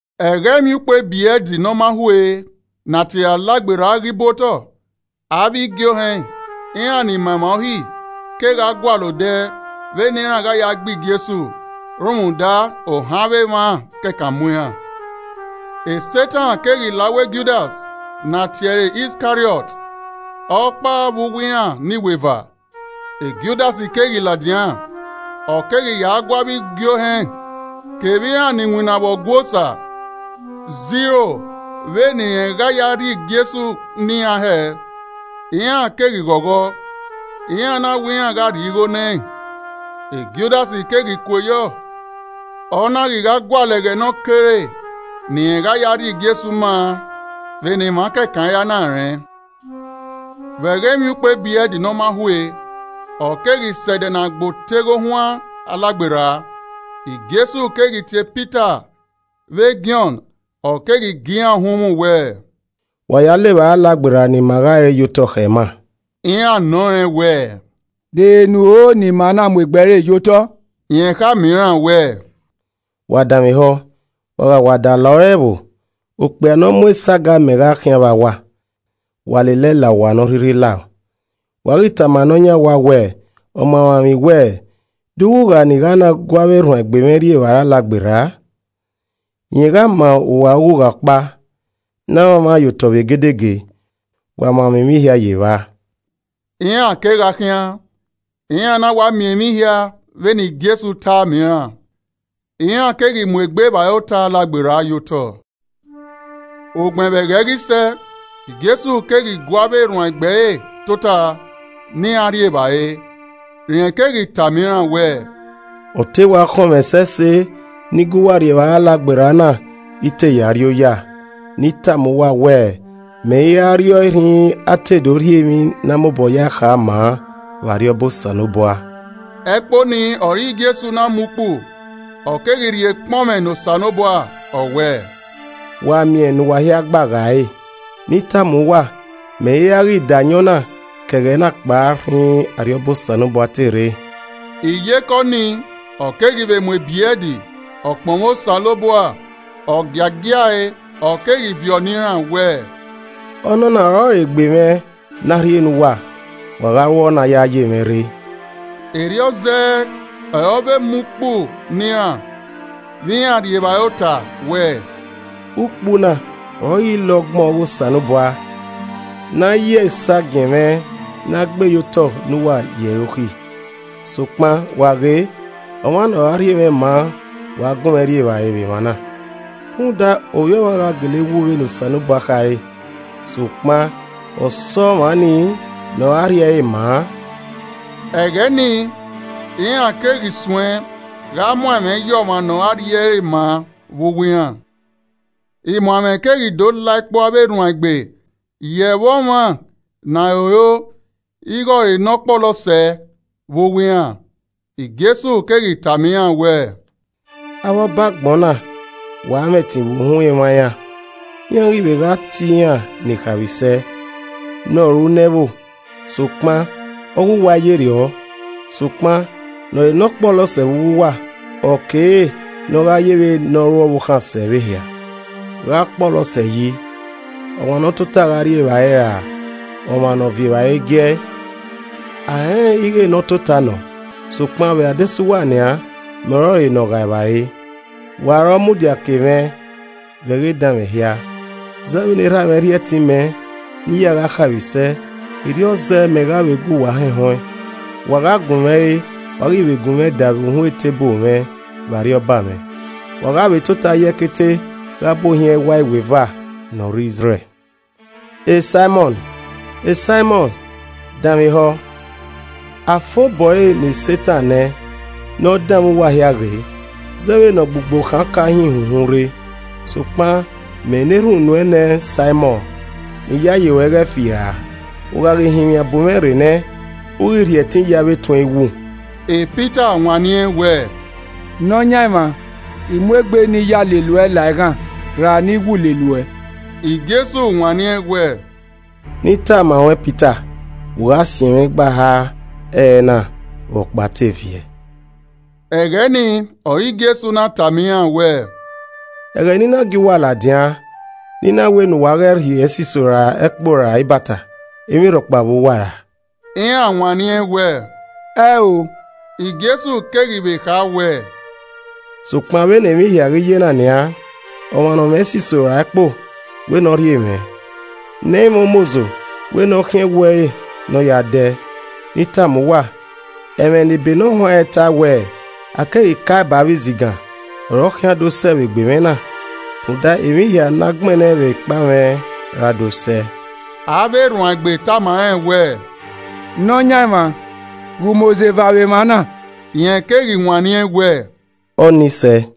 Ẹghẹ Emwiukpo Ebrẹd Ne ọ ma hue ne a tie ẹre Alagberra ghi bu otọ. Avbe igie ohẹn, iran ni ma emwa Uhi, keghi gualọ odẹ vbene iran gha ya gbe Jesu rhunmwuda ohan avbe emwa kẹkan mu iran. Setan keghi la uwu Judas ne a tie ẹre Iskariọt, ọkpa vbe uwu iran ne iweva. Judas keghi ladian, ọ keghi ya gu avbe igie ohẹn kevbe iran ni winna vbe Ọgua Osa zẹ iro vbene irẹn gha ya rhie Jesu ne iran hẹẹ. Iran keghi ghọghọ, iran na wẹ iran gha rhie igho nẹẹn. Judas keghi kue yọ, ọ na ghi gha gualọ ẹghẹ ne ọ kere ne irẹn gha ya rhie Jesu maa vbene emwa kẹkan ira na rẹn. Vbe ẹghẹ Emwiukpo Ebrẹd ne ọ ma hue, ọ keghi sẹ ẹdẹ ne a gbe oteghe ohuan Alagberra. Jesu keghi tie Pita vbe Jọn, ọ keghi gie iran uhunmwu wẹẹ, “Wa ya le evbare Alagberra ne ima gha re ye otọ khẹ ima.” Iran nọ rẹn wẹẹ, “De ehe ne u ho ne ima na muegbe ẹre ye otọ?” Rẹn khama iran wẹẹ, “Wa danmwehọ, wa gha wa da la ore ẹvbo, okpia ne ọ mu esago amẹ gha khian vba uwa. Wa lele ẹe la owa ne ọ rhirhi lao. Wa ghi tama ne ọ yan owa wẹẹ, ‘Ọmamwaemwi wẹ, De ughugha ne I gha na gu avbe erhuanegbe mwẹ rri evbare ota Alagberra?’ Rẹn gha ma uwa ughugha ọkpa ne a mwamwa ye otọ vbe egedege, wa mwamwa emwi hia ye evba.” Iran kegha khian, iran na wa miẹn emwi hia vbene Jesu tae ma iran, iran keghi muegbe evbare ota Alagberra ye otọ. Ugbẹn vbe ẹghẹ ghi sẹ, Jesu keghi gu avbe erhuanegbe ẹre tota ne iran rri evbare. Rẹn keghi tama iran wẹẹ, “Ọ te wa khọnmwẹ ẹsẹse ne I gu uwa rri evbare Alagberra na I te ya rrioya. Ne I tama uwa wẹ mẹ i ra rriọe rhinrin a te do rhie emwi na mobọ ya ẹe kha ma an vbe Arriọba Osanobua.” Ẹkpo nii ọre Jesu na mu ukpu, ọ keghi rhie ekpọnmwẹ ne Osanobua, ọ wẹẹ, “Wa miẹn ne uwa hia gba ghae ẹre. Ne I tama uwa mẹ i ra ghi da ayọn na ke ẹghẹ na kpao rhinrin Arriọba Osanobua te rre.” Iyeke ọnii, ọ keghi vbe mu ebrẹd, ọ kpọnmwẹ Osanobua, ọ giagia ẹe, ọ keghi viọ ne iran wẹẹ, “Ọnọna ọrọre egbe mwẹ ne a rhie ne uwa. [Wa gha ru ọna ya ye mwẹ rre.” Erriọ zẹẹ ọre ọ vbe mu ukpu ne iran, vbe iran rri evbare ota wẹ, “Ukpu na ọrọre ile ọgbọn ọghe Osanobua ne a ya esagiẹn mwẹ ne a gbe ye otọ ne uwa yi ẹre okhi!”] “Sokpan, wa ghe, ọmwa ne ọ ra rhie mwẹ maa wa gunmwẹ rri evbare vbe emwa na! Rhunmwuda, Ovbi Ọmwa gha gele wu vbene Osanobua khare, sokpan ọse ọmwa nii ne ọ ra rhie ẹre ma an!” Ẹghẹ nii iran keghi suẹn gha muan ẹmwẹ ye ọmwa ne ọ ra rhie ẹre ma vbe uwu iran. Imuanẹmwẹ keghi do la ẹkpo avbe erhuanegbe ye ẹmwẹ ọmwa ne a roro ighẹ ọre ne ọ kpọlọ sẹ vbe uwu iran. Jesu keghi tama iran wẹẹ, “Avbe ọba agbọn na wa mwẹ ẹtin vbe uhunmwu emwa iran, iran ghi vbe gha tie iran ni khaemwisẹ, ‘Ne ọ ru ne ẹvbo.’ Sokpan, Ọghe uwa, i yerriọ, sokpan ne ọre ne ọ kpọlọ sẹ vbe uwu uwa, ọ kere ne ọ gha yevbe ne ọ ru ọvbokhan sẹ vbe ehia. Gha ọ kpọlọ sẹ yi, ọmwa ne ọ tota gha rri evbare ra ọmwa ne ọ viọ evbare gi ẹe? A rẹnrẹn ighe ne ọ tota nọ. Sokpan vbe adesẹ uwa nian mẹ ọrọre ne ọ ghae evbare! “Wa ọre ọ mudia ke mwẹ vbe ẹghẹ edanmwẹ hia. Zẹ vbene Erha mwẹ rhie ẹtin mẹ ne I ya gha khaemwisẹ, erriọ zẹ me gha vbe gu uwa hẹnhẹn ọẹn. Wa gha gun mwẹ re, wa ghi vbe gun mwẹ da vbe uhunmwu eteburu mwẹ vbe Arriọba mwẹ, wa gha vbe tota ye ẹkete gha bu ohiẹn ẹwae iweva ne ọ re Izrẹl. “Saimọn! Saimọn! Danmwehọ. A fan obọ ẹre ne Setan nẹ ne ọ danmwẹ uwa hia ghe zẹ vbene ọgbugbo khan ọka hin uwu ihunhun rre. Sokpan mẹ na erhunmwu nuẹn nẹ Saimọn ne iyayi ruẹ ghẹ i fira, u gha ghi hinmwian bu mwẹ rre nẹ, u ghi rhie ẹtin ye avbe etuẹn iwu.” Pita wanniẹn wẹẹ, “Nọyaẹnmwa, mẹ mu egbe ne I ya lele uẹ la eghan ra ne I wu lele uẹ.” Jesu wanniẹn wẹẹ, “Ne I tama ruẹn Pita, u gha siẹn mwẹ igba eha ẹrẹna vbe ọkpa te viẹ.” Ẹghẹ nii ọre Jesu na tama iran wẹẹ, “Ẹghẹ ne I na gie uwa ladian, ne I na wẹ ne uwa ghẹ rhie ẹsiso ra ẹkpo ra ibata, emwi rhọkpa vbe uwa ra?” Iran wanniẹn wẹẹ, “Ẹn o.” Jesu keghi vbe kha wẹẹ, “Sokpan vbene emwi hia ghi ye na nian, ọmwa ne ọ mwẹ ẹsiso ra ẹkpo, wẹ ne ọ rhie mwẹ, ne ẹ i mwẹ umozo wẹ ne ọ khiẹn ẹwu ẹre ne ọ ya dẹ. Ne I tama uwa, ẹmwẹ ne ebe ne ọ huanrẹn tae wẹẹ, ‘A keghi ka ẹe ba avbe izigan,’ ọre ọ khian do sẹ vbe egbe mwẹ na. Rhunmwuda emwi hia ne a gbẹnnẹ vbe ekpa mwẹ ra do sẹ.” Avbe erhuanegbe tama rẹn wẹẹ, “Nọyaẹnmwa, ghe umozo eva vbe emwa na.” Rẹn keghi wanniẹn wẹẹ, “Ọnii sẹe!”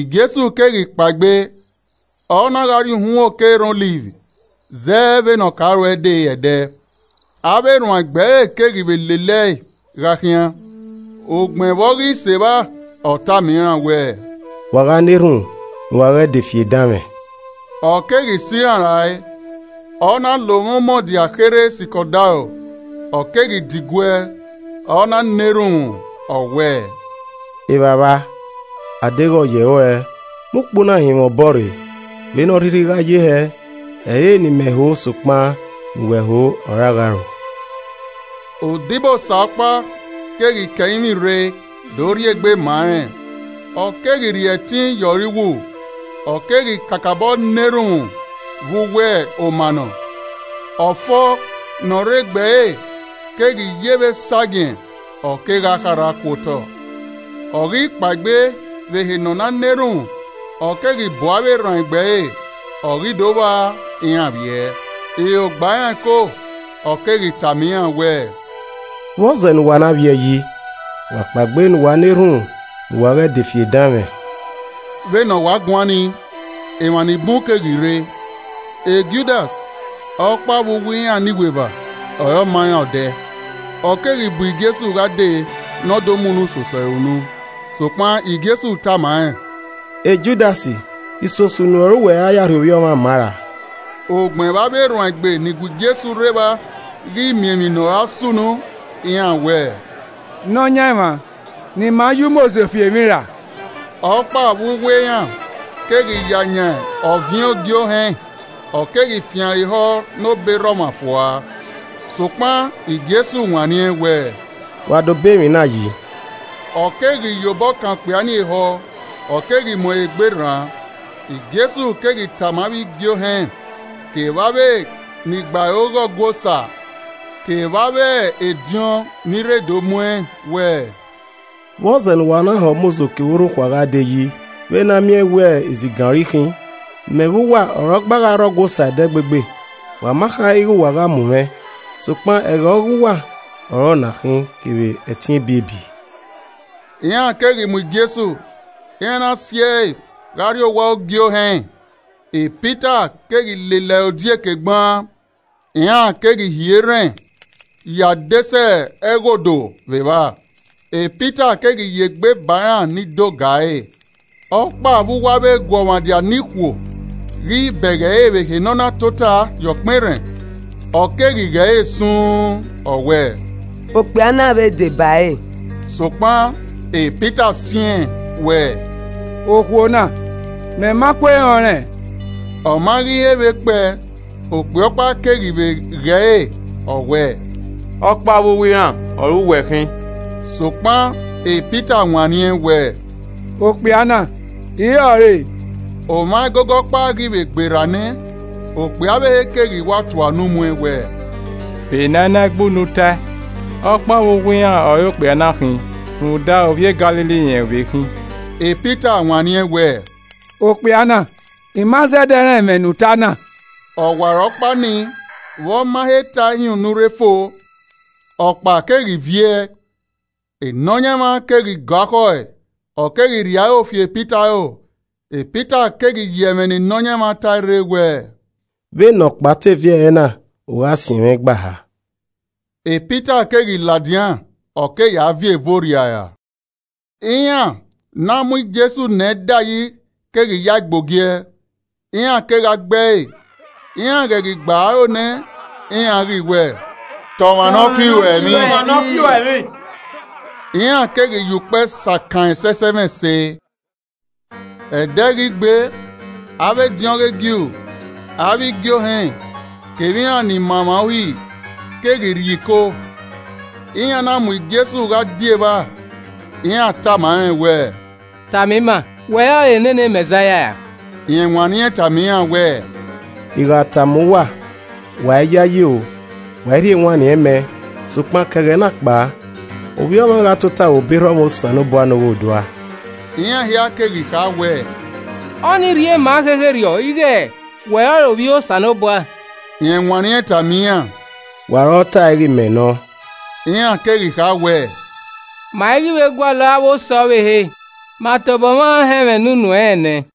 Jesu keghi kpaegbe, ọ na gha rrie uhunmwu oke erhan Ọliv, zẹ vbene ọ ka ru de ẹdẹ, avbe erhuanegbe ẹre keghi vbe lele ẹe gha khian. Ugbẹn vbe ọ ghi sẹ evba, ọ tama iran wẹẹ, “Wa gha na erhunmwu ne uwa ghẹ de fi edanmwẹ.” Ọ keghi sẹ iran rae, ọ na la omwa umọdia kherhe sikẹ odaro, ọ keghi diguẹ ọ na na erhunmwu. Ọ wẹẹ, “Evbavba, a deghẹ ọ yẹ ruẹ, mu ukpu na hin mwẹ obọ rre, vbene ọ rhirhi gha ye hẹ, ẹ i re ne I mẹ ho sokpan ne uwẹ ho ọre a gha ru.” [ Odibosa ọkpa keghi ke ẹrinmwi rre do rhie egbe ma rẹn, ọ keghi rhie ẹtin ye ọre iwu. Ọ keghi kakabọ na erhunmwu vbe uwu omanọ, ọfo ne ọ rre egbe ẹre keghi ye vbe esagiẹn, ọ kegha kharha ku otọ.] Ọ ghi kpaegbe vbe ehe ne ọ na na erhunmwu, ọ keghi bu avbe erhuanegbe ẹre, ọ ghi do vba iran vbiẹ, iro gba iran ẹko. Ọ keghi tama iran wẹẹ, “Vbọzẹ ne uwa na vbiẹ yi? Wa kpaegbe ne uwa na erhunmwu ne uwa ghẹ de fi edanmwẹ.” Vbene ọ wa guan ni, emwa ni bun keghi rre, “Judas, ọkpa vbe uwu iran ne iweva ọ re ọ ma iran odẹ, ọ keghi bu Jesu gha dee ne ọ do mu unu soso ẹre unu. Sokpan Jesu tama rẹn, Judas, isoso unu ọre uwẹ ra ya rhie Ovbi Ọmwa ma ra?” Ugbẹn vbe avbe erhuanegbe ni gu Jesu rre evba ghi miẹn emwi ne ọra sunu, iran wẹẹ, “Nọyaẹnmwa, ne ima ya umozo fi emwi ra?” Ọkpa vbe uwu iran keghi ya yan ọviẹn Ogie Ohẹn, ọ keghi fian ẹre ehọ ne obọ erha ọmwa fua. Sokpan Jesu wanniẹn wẹẹ, “Wa dobọ emwi na yi.” Ọ keghi ye obọ kan okpia nii ehọ, ọ keghi mu ẹre egbe rran. Jesu keghi tama avbe igie ohẹn kevbe avbe ni gbe aro ghe Ọgua Osa kevbe avbe ediọn ni rre do mu ẹn wẹẹ, “Vbọzẹ ne uwa na hẹ umozo kevbe orhokhua gha de yi vbe ne a miẹn wẹ izigan ọre I khin? Mẹ vbe uwa ọre ọ gba gha rre Ọgua Osa ẹdẹgbegbe, wa ma kha ighẹ uwa gha mu mwẹ, sokpan ẹghẹ ọghe uwa ọre ọ na khin kevbe ẹtin ebiebi.” Iran keghi mu Jesu, iran na si ẹe gha rrie owa Ogie Ohẹn, Pita keghi lele ẹre odieke gbaan. Iran keghi hie erhẹn ye adesẹ ẹghodo vbe evba, Pita keghi ye egbe ba iran ni do ga ẹre. Ọkpa vbe uwu avbe eguọmwadia ne ikhuo ghi bẹghe ẹre vbe ehe ne ọ na tota ye ọkpẹn erhẹn, ọ keghi ghe ẹre suun, ọ wẹẹ, “Okpia na vbe deba ẹre.” Sokpan Pita siẹn wẹẹ, “Okhuo na, mẹ ma kue rẹn ọnrẹn.” Ọma ghi he vbe kpẹe, okpia ọkpa keghi vbe ghe ẹre, ọ wẹẹ, “Ọkpa vbe uwu iran ọre uwẹ khin.” Sokpan Pita wanniẹn wẹẹ, “Okpia na I i re ọre.” Omwa ẹgogo ọkpa ghi vbe gbe rra nẹ, okpia ọvbehe keghi wa tua unu muẹn wẹẹ, “Vbe ne a i na gbe unu tae, ọkpa vbe uwu iran ọre okpia na khin rhunmwuda ovbi e Galili rẹn vbe khin.” Pita wanniẹn wẹẹ, “Okpia na, I ma zẹdẹ rẹn ẹmwẹ ne uta na!” Ọwarọkpa nii, vbe ọ ma he tae hin unu rre fo, ọkpa keghi viẹ. E Nọyaẹnmwa keghi gọ akhọe, ọ keghi rhie aro fi Pita aro. Pita keghi ye ẹmwẹ ne Nọyaẹnmwa tae rre wẹẹ, “Vbene ọkpa te viẹ ẹrẹna, u gha siẹ mwẹ igba eha.” Pita keghi ladian, ọ keghi ya viẹ eve orriara. Iran ne a mu Jesu nẹ dayi keghi yae gbe ogiẹ, iran kegha gbe ẹe. Iran ghẹ ghi gba ẹre aro nẹ, iran ghi wẹẹ, “Ta ọmwa ne ọ fi uẹ emwi!” Iran keghi ya ukpẹ sakan ẹn ẹsẹsẹmwẹse. Ẹdẹ ghi gbe, avbe ediọn ọghe Ju, avbe igie ohẹn, kevbe iran ni ma emwa Uhi keghi rrie iko, iran na mu Jesu gha die evba. Iran tama rẹn wẹẹ, “Tama ima, wẹ ọrọre nene Mẹzaia ra?” Rẹn wanniẹn tama iran wẹẹ, “I gha tama uwa, wa i yayi, o, wa i rhie ewanniẹn mẹ. Sokpan ke ẹghẹ na kpao, Ovbi Ọmwa gha tota vbe obọ erha ọmwa Osanobua ne Oghodua.” Iran hia keghi kha wẹẹ, “Ọnii rhie ma khekherriọ ighẹ wẹ ọrọre Ovbi Osanobua?” Rẹn wanniẹn tama iran, “Wa ọre ọ tae ighẹ mẹ nọ.” Iran keghi kha wẹẹ, “Ma i ghi vbe gualọ avbe osẹe ọvbehe. Ma tobọ mwa họn ẹmwẹ ne unu ẹnrẹn nẹ!”